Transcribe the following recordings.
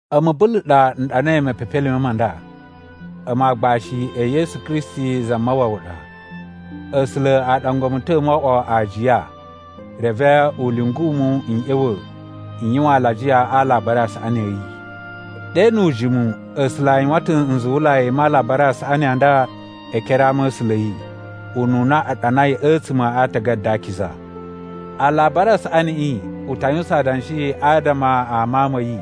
A̱mu Bulu ɗa n ɗanai mepepelime ma nda. A̱mu aagbashi e Yesu Kristi Zamawawa ɗa. A̱sula̱ a ɗangwa mu ta̱ mo oꞌwo aajiya, reve u lyungu mu n ꞌya̱wa̱ n yuwan alajiya a Alabari a Saꞌani a̱ yi. Ɗe nu ujimu, A̱sula̱ a yuwan ta̱ nzuwulai ma Alabari a Saꞌani a nda e ekere a ama̱sula̱ a̱ yi, ununa a ɗanai a̱tsuma̱ a Aatagada a Akiza. Alabari a Saꞌaniꞌi u ta yuwusan adanshi adama a Mawun ma̱ yi,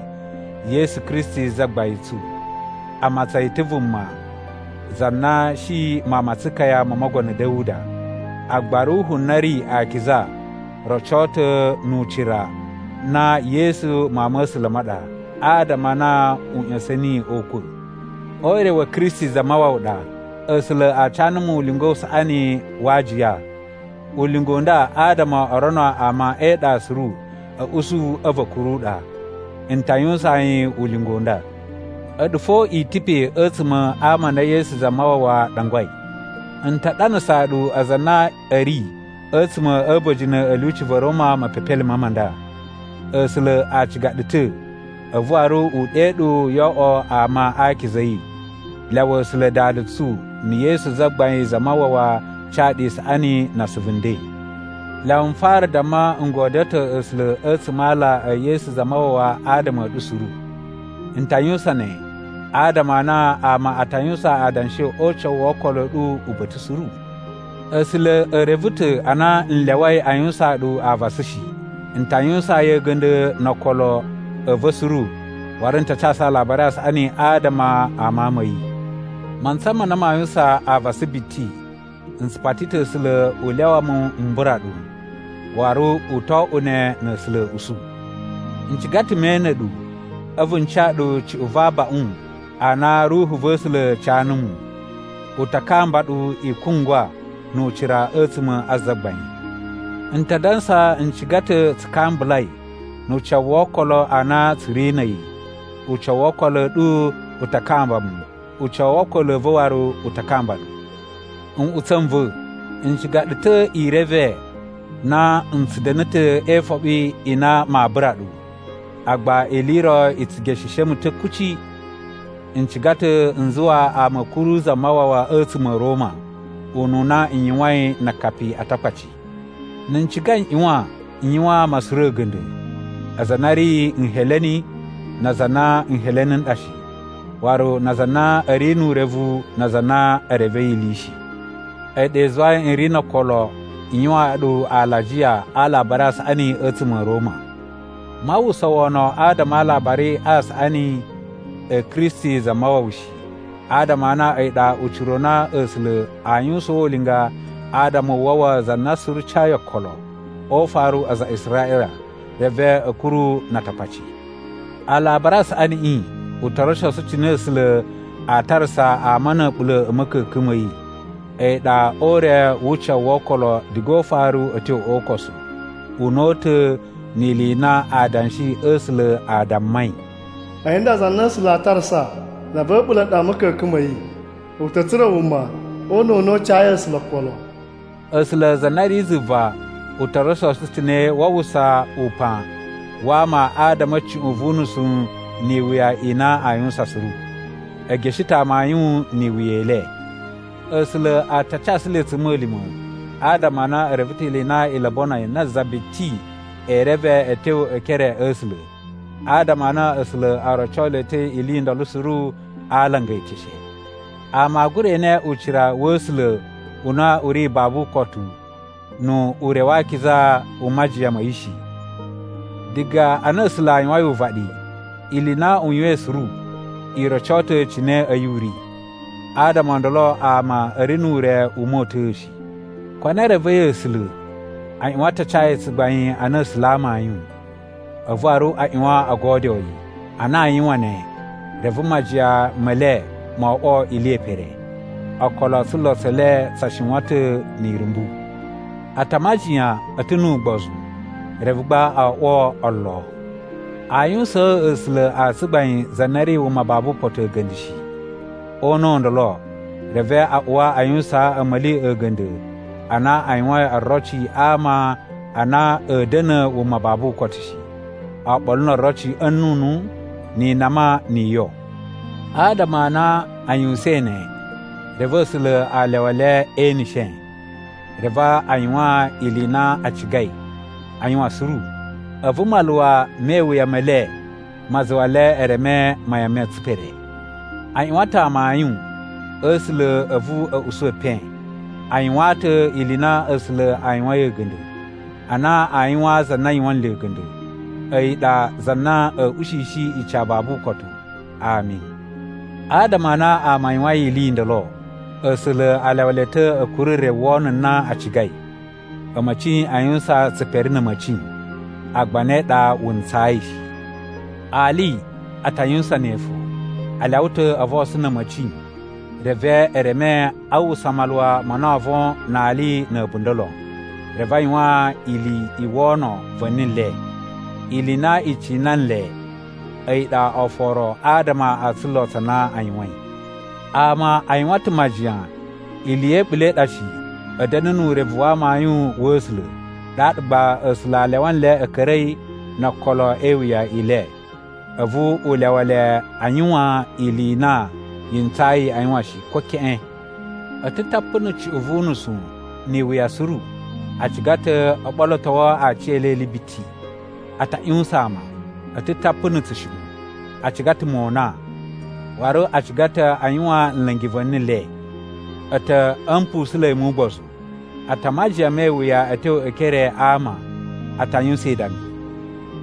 Yesu Kristi Zagbain tsu. A matsan yi ta̱ vuma za na shi mawun ma tsukaya mo Mogono Da̱wuda. Agba Ruhu na ri akiza roco ta̱ nu ucira na Yesu Mawun ma̱ A̱sula̱ ma ɗa, adama a na u ꞌya̱sa̱n niyi o ukwa̱. O ure wa̱ Kristi Zamawawa ɗa, A̱sula̱ a ca numu ulinga u saꞌani wa aajiya. Ulinga u nda adama o rono ama e iɗa suru a̱ usu a̱vu a̱ kuru ɗa. N ta yuwusaan yi ulinga u nda. A̱ɗu fo i ta̱ pe a̱tsuma̱ a ama a na Yesu Zamawawa ɗangwai. N ta ɗanasaa ɗu aza a na a̱ ri a̱tsuma̱ a̱ a̱ba̱jini a̱ lyuci va̱ Roma mepepelime ma nda. A̱sula̱ a ciga ɗu ta̱ a̱vu waru u ɗe ɗu yo oꞌwo ama a akiza a̱ yi. Lyawa A̱sula̱ Dada tsu na̱ Yesu Zagbain Zamawawa ca ɗu isaꞌani na asuvu nden. Lyawa n fara damma n godyo ta̱ A̱sula̱ a̱tsuma̱ a ala e Yesu Zamawawa adama a̱ ɗu suru. N ta yuwusan ne adama a na ama a ta yuwusan adanshi o ucawu wo okolo a̱ ɗu uba̱ta̱ suru. A̱sula̱ e reve ta̱ a na n lyawai a yuwusaan ɗu avasa shi, n ta yuwusaan yi a̱ga̱nda̱ no okolo a̱ va̱ suru waru n ta casu Alabari a Saꞌani adama a Mawun ma̱ yi. Mantsa ma na maa yuwusan avasa biti, n tsu pati ta̱ A̱sula̱ u lyawa mu m bura ɗu, waru u to oꞌwo ne na̱ A̱sula̱ a̱ usu. N ciga ta̱ me ene ɗu, a̱vu n ca ɗu cuꞌun va abaꞌun a na Ruhu va̱ A̱sula̱ ca numu. U ta kamba ɗu i kungwa nu ucira a̱tsuma̱ a Zagbain. N ta dansa n ciga ta̱ tsu kambulai nu ucawu wo okolo a na tsu ri na̱ a̱yi. Ucawu wo okolo a̱ ɗu u ta kamba mu, ucawu wo okolo a̱ va̱ waru u ta kamba ɗu. Nꞌutsa̱ n va̱, n ciga ɗu ta̱ i reve na n tsu da̱na̱ ta̱ e ifoɓi i na maa bura ɗu. Agba ili i ro i tsu gesheshe mu ta̱ kuci. N ciga ta̱ n zuwa ama a̱ kuru Zamawawa a̱tsuma̱ a̱ Roma, ununa n yuwain na akapi a Atakpaci. Na̱ n ciga n ꞌyuwan n yuwaan ama suru a̱ga̱nda̱: aza a na a̱ ri Nheleni na aza a na Nheleni n ɗa shi, waru na aza a na a̱ ri nu urevu na aza a na e revei ili shi. A̱yi ɗa i zuwai n ri no okolo n yuwaan ɗu alajiya a Alabari a Saꞌani a̱tsuma̱ a̱ Roma. Maa uwwusa wono adama a Alabari a Saꞌani a̱ Kristi Zamawawa shi, adama a na a̱yi ɗa ucira u na A̱sula̱ aa yuwusaan ulinga adama u wawa za na suru cayi okolo, o ufaru aza a Israꞌila reve a̱ kuru na Atakpaci. Alabari a Saꞌaniꞌi u to rocosu cine A̱sula̱ aa tarasa ama na̱ a̱ɓula̱ a̱ ma̱ka̱ka̱n ma̱ yi, a̱yi ɗa o ure wu ucawu wo okolo diga o ufaru a̱ tyo o ukosu. Una̱ta̱ ni ili i na Adanshi a̱ A̱sula̱ a dammai, “A̱yi nda za na A̱sula̱ a tarasa za va̱ a̱ɓula̱ ɗa a̱ ma̱ka̱ka̱n ma̱ yi, u ta̱ tsura̱ wuma o una̱ u na u cayi A̱sula̱ okolo.” A̱sula̱ za na ri zuva u to rocosu cine waa uwwusa upan wa ama adama a̱ cuꞌun vu nusu ni iwuya i na aa yuwusan suru. E geshe ta̱ amayun ni iwuya i le. A̱sula̱ a ta casu le a̱tsuma̱lima̱ adama a na e reve ta̱ ili i na i lobonoi na za biti ee reve a̱ tyo e ekere a̱ A̱sula̱, adama a na A̱sula̱ o roco le ta̱ ili i ndolo suru a alanga e eteshe. Ama aa gura ene ucira wa̱ A̱sula̱ u na u ri babu ukotu nu ure wa akiza u majiyan ma̱ yi shi. Diga ana A̱sula̱ a yuwain uvaɗi, ili i na u yuwain suru i roco ta̱ cine a̱yi u ri. Adama o ndolo ama a̱ ri nu ure u mota̱a̱ shi. Ko na e revei A̱sula̱, a ꞌyuwan ta a ca yi tsugbain ana A̱sula̱ a amayun, a̱vu waru a ꞌyuwan o godyoo yi. Ana aa yuwan ne, reve majiyan me le mo oꞌwo ili ye pere. Okolo o tsulo tse le tsa shiwan ta̱ ni irumbu. A ta majiyan a̱ ta̱ nu ugbozu, reve gba o oꞌwo olo. Aa yuwusaan A̱sula̱ a tsugbain za na ri wuma babu ukotu a̱ga̱nda̱ shi. O una̱ u ndolo, reve a uwa a yuwusaan a̱ma̱li a̱ga̱nda̱ a na a yuwain oroci a ama a na a̱a̱ da̱na̱ wuma babu ukotu shi, oɓolo no oroci a̱ nnunu, ni inama, ni iyo. Adama a na a yuwusain ne, reve A̱sula̱ a lyawa le e eneshe. Reve a yuwan ili i na a cigai a yuwan suru, a̱vu maluwa me iwuya me le ma zuwa le e reme mayan ma̱ tsipere. A ꞌyuwan ta̱ amayun a̱ A̱sula̱ a̱vu a̱ usu epen. A yuwaan ta̱ ili i na A̱sula̱ a yuwain a̱ga̱nda̱, ana a yuwaan za na yuwan nle a̱ga̱nda̱. A̱yi ɗa za na a̱a̱ ushishi ica babu ukotu. Ami. Adama a na ama a yuwain ili i ndolo, A̱sula̱ a lyawa le ta̱ a̱ kuru re wono na a cigai. A̱ma̱ci a yuwusan tsipere na̱ a̱ma̱ci, agba ne ɗa wu ntsayi shi. Ali a ta yuwusan ne fo. A lyawa ta̱ o vosun na̱ a̱ma̱ci reve e reme a uwwusa maluwa ma na oo von na ali na̱ a̱bunda̱ lon. Reve a yuwan ili i wono va̱ni le, ili i na i cina nle a̱yi ɗa oforo adama o tsulo tsa na a yuwain. Ama a yuwan ta̱ majiyan ili ya̱ a̱ɓula̱ i ɗa shi a̱ da̱na̱ nu urevu wa amayun wa̱ A̱sula̱. Ɗaɗa gba A̱sula̱ a lyawa nle a̱ ka̱ra̱i no okolo e iwuya i le, a̱vu u lyawa le a yuwan ili i na yi ntsayi aa yuwan shi, ko keꞌen. A̱ ta̱ tapu na̱ cuꞌun vu unusu ni iwuya suru. A ciga ta̱ o ɓolotowo aciyele ili biti. A ta ꞌyuwusan ama. A̱ ta̱ tapu na̱ tsushuꞌun. A ciga ta̱ mona, waru a ciga ta̱ a yuwan nla̱ngi va̱ni le. A̱ ta̱ a̱ mpusunla̱i mu ugbozu. A ta majiyan me iwuya a̱ tyo e ekere a ama. A ta yuwusan idami.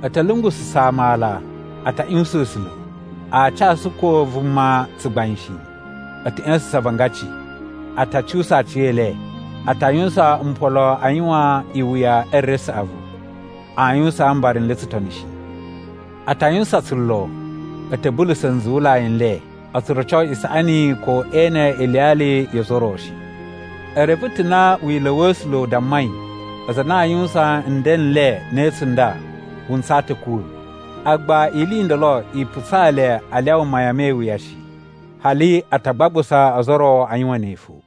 A̱ ta̱ lungususa̱ ama ala. A ta ꞌyuwusan A̱sula̱. Aa casu ko vuma tsugbain shi. A̱ ta̱ ꞌya̱sa̱sa̱n avangaci. A ta cuwusa aciyele. A ta yuwusan mpolo a yuwan iwuya e re saꞌavu. Aa yuwusaan mbara n le tsutoni shi. A ta yuwusan tsulo. A̱ ta̱ bulusa̱ nzuwulai n le. O tsu roco isaꞌani ko e ene iliyali yo ozo o ro shi. E reve ta̱ na wila̱ wa̱ A̱sula̱ u dammai aza a na aa yuwusan nden n le ne tsunda, wu ntsaa ta̱ a̱ kuwa̱. Agba ili i ndolo i putsaa le a lyawa mayan me iwuya shi. Hali a ta gbagbusa ozo o ro a yuwan ne fo.